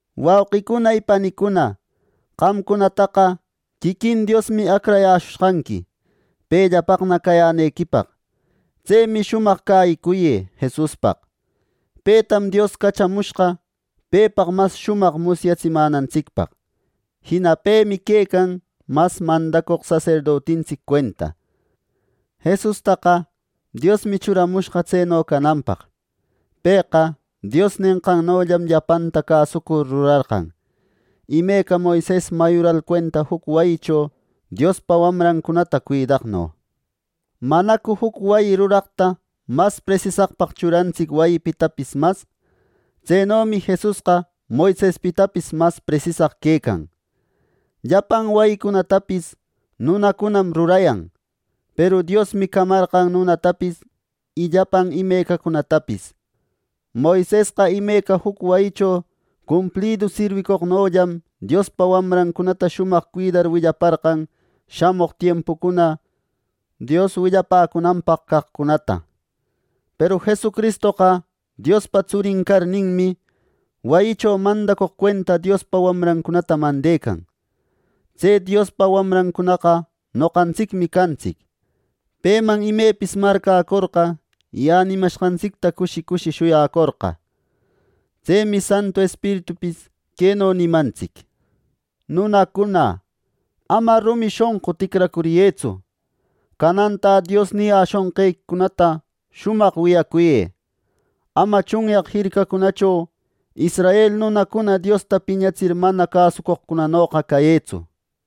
Wauqicuna y panicuna, qamcunataqa quiquin Diosmi acrayäshushqanqui pellapaqna cayänequipaq. Tsemi shumaq cäyicuyë Jesuspaq. Petam Dios cachamushqa pepaq mas shumaq musyatsimänantsicpaq. Jina pemi quecan mas mandacoq saserdotintsic cuenta. Jesustaqa Diosmi churamushqa tseno cananpaq. Pëqa Dios nenqannollam llapanta cäsucur rurarqan, imeca Moises mayural cuenta juc wayicho Diospa wamrancunata cuidaqno. ¿Manacu juc wayi ruraqta mas presisaqpaq churantsic wayipitapis mas! Tsenomi Jesusqa Moisespitapis mas presisaq quecan. Llapan wayicunatapis nunacunam rurayan, peru Diosmi camarqan nunatapis y llapan imecacunatapis. Moisesqa imeca juc wayicho cumplidu sirwicoqnollam Diospa wamrancunata shumaq cuidar willaparqan shamoq tiempucuna Dios willapäcunanpaq caqcunata. Peru Jesucristoqa Diospa Tsurin carninmi, wayicho mandacoq cuenta Diospa wamrancunata mandecan. Tse Diospa wamrancunaqa noqantsicmi cantsic, peman imepis marcäcorqa y änimashqantsicta cushi cushi shuyacorqa. Tsemi Santu Espiritupis queno nimantsic: “Nunacuna, ama rumi shonqu ticracuriyëtsu. Canantä Dios niyäshunqequicunata shumaq wiyacuyë. Ama tsunyaq jircacho israel nunacuna Diosta piñatsir mana cäsucoqcunanoqa cayëtsu.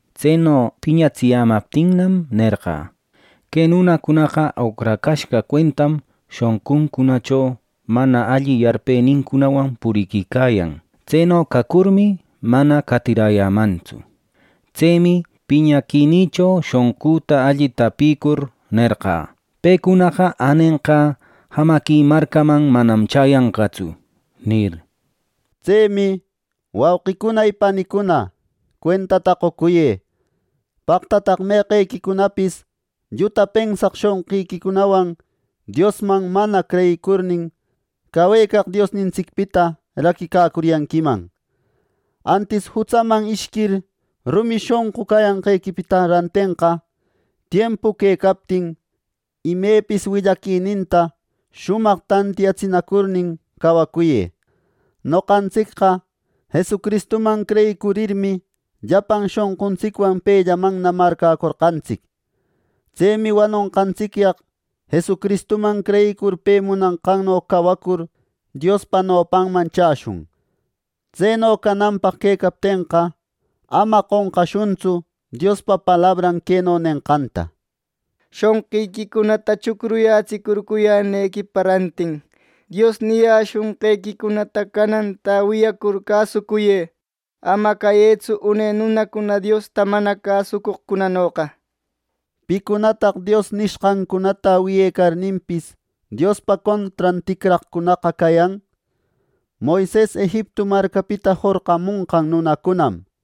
Tseno piñatsiyämaptinnam, nerqä: ‘Que nunacunaqa oqracashqa cuentam shonquncunacho mana alli yarpenincunawan puriquicayan. Tseno cacurmi, mana qatiräyämantsu.’ Tsemi piñaquinïcho shonqüta alli tapïcur nerqä: ‘Pecunaqa änenqä jamaqui marcäman manam chäyanqatsu’ nir.” Tsemi, wauqicuna y panicuna, cuentata qocuyë; paqtataq meqequicunapis lluta pensaq shonqiquicunawan Diosman mana creyicurnin, cawecaq Diosnintsicpita raquicacuriyanquiman. Antis jutsaman ishquir rumi shonqu cayanqequipa rantenqa tiempu quecaptin, imepis willaquininta shumaq tantiyatsinacur cawacuyë. Noqantsicqa Jesucristumannam creyicurirmi, llapan shonquntsicwan pellamanna marcäcorqantsic. Tsemi wanonqantsicyaq Jesucristuman creyicur pe munanqanno cawacur Diospa nopanman chäshun. Tseno cananpaq quecaptenqa, ama qonqashuntsu Diospa palabran queno nenqanta: “Shonqïquicunata chucruyätsicurcuyänequipa rantin Dios niyäshunqequicunata canantä wiyacur cäsucuyë. Ama cayëtsu une nunacuna Diosta mana cäsucoqcunanoqa.” ¿Picunataq Dios nishqancunata wiyecarninpis, Diospa contran ticraqcunaqa cayan: Moises Egiptu marcapita jorqamunqan nunacunam!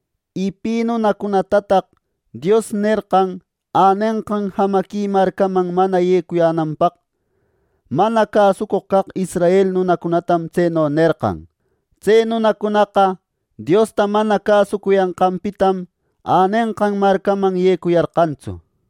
Y ¿pi nunacunatataq Dios nerqan änenqan jamaqui marcaman mana yecuyänanpaq: Mana cäsucoq caq israel nunacunatam tseno nerqan! Tse nunacunaqa Diosta mana cäsucuyanqanpitam änenqan marcaman yecuyarqantsu.